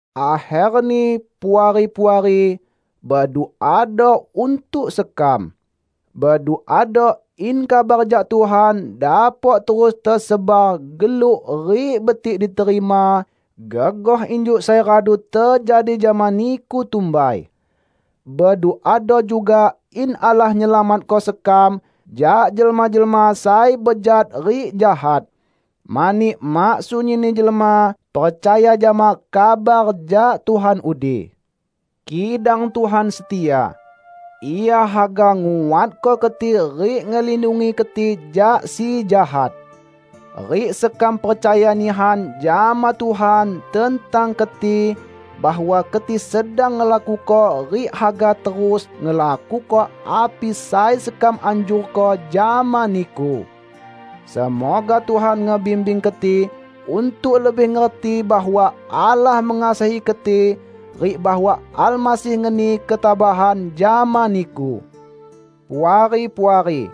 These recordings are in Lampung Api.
Akherni, Puari-puari, beduado untuk sekam. Beduado in kabar jak Tuhan dapok terus tesebar geluk rik betik diterima, gegoh injuk sai radu tejadi jama niku tumbai. Beduado juga in Allah nyelamatko sekam jak jelma-jelma sai bejat rik jahat. Mani mak sunyinni jelma percaya jama kabar jak Tuhan udi. Kidang Tuhan setia. Ia haga nguatko keti rik ngelindungi keti jak Si Jahat. Rik sekam percaya nihan jama Tuhan tentang keti; bahwa keti sedang ngelakuko rik haga terus ngelakuko api sai sekam anjurko jama niku. Semoga Tuhan ngebimbing keti untuk lebih ngerti bahwa Allah mengasihi keti rik bahwa Almasih ngeni ketabahan jama niku. Puari-puari,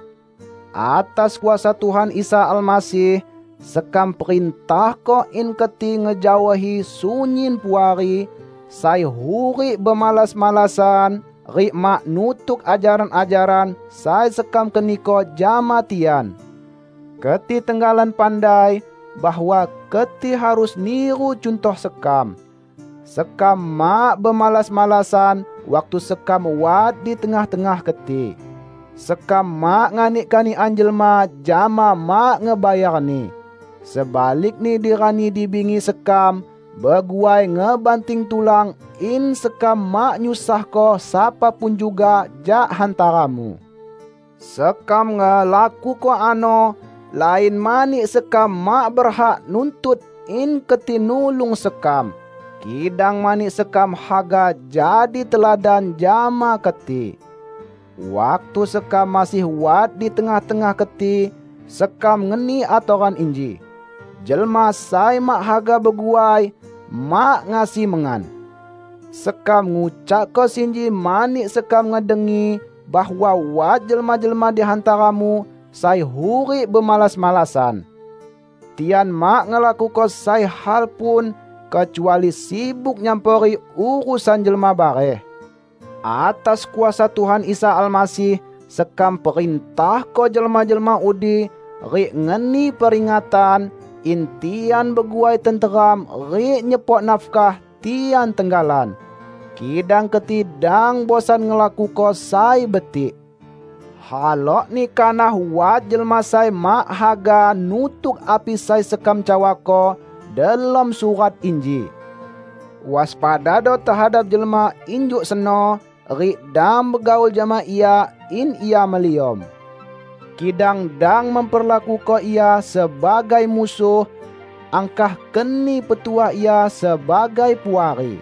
atas kuasa Tuhan Isa Almasih, sekam perintahko in keti ngejaohi sunyin puari, sai hurik bemalas-malasan, rik mak nutuk ajaran-ajaran sai sekam keniko jama tian. Keti tenggalan pandai bahwa keti harus niru cuntoh sekam. Sekam mak bemalas-malasan waktu sekam wat di tengah-tengah keti. Sekam mak nganik kanikan jelma jama mak ngebayarni. Sebalikni di rani di bingi sekam beguai ngebanting tulan in sekam mak nyusahko sapa pun juga jak hantaramu. Sekam ngelakuko ano lain mani sekam mak berhak nuntut in keti nulung sekam, kidang mani sekam haga jadi teladan jama keti. Waktu sekam masih wat di tengah-tengah keti, sekam ngeni atoran inji, "Jelma sai mak haga beguai, mak ngasi mengan." Sekam ngucakko sinji mani sekam ngedengi bahwa wat jelma-jelma di hantaramu sai hurik bemalas-malasan. Tian mak ngelakuko sai hal pun, kecuali sibuk nyampori urusan jelma bareh. Atas kuasa Tuhan Isa Almasih sekam perintahko jelma-jelma udi rik ngeni peringatan, in tian beguai tenteram rik nyepok nafkah tian tenggalan. Kidang keti dang bosan ngelakuko sai betik. Halokni kanah wat jelma sai mak haga nutuk api sai sekam cawako delom surat inji. Waspadado tehadap jelma injuk seno rik dang begaul jama ia in ia meliom. Kidang dang memperlakuko ia sebagai musuh, angkah keni petuah ia sebagai puari.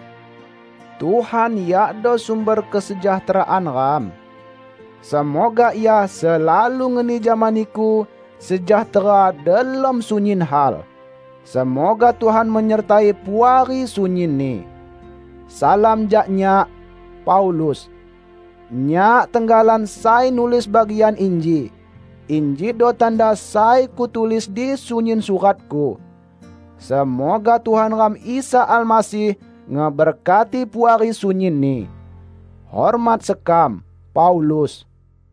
Tuhan yakdo sumber kesejahteraan ram. Semoga Ia selalu ngeni jama niku sejahtera delom sunyin hal. Semoga Tuhan menyertai Puari sunyinni. Salam jak nyak, Paulus. Nyak tenggalan sai nulis bagian inji. Injido tanda sai kutulis di sunyin suratku. Semoga Tuhan ram Isa Almasih ngeberkati Puari sunyinni. Hormat sekam, Paulus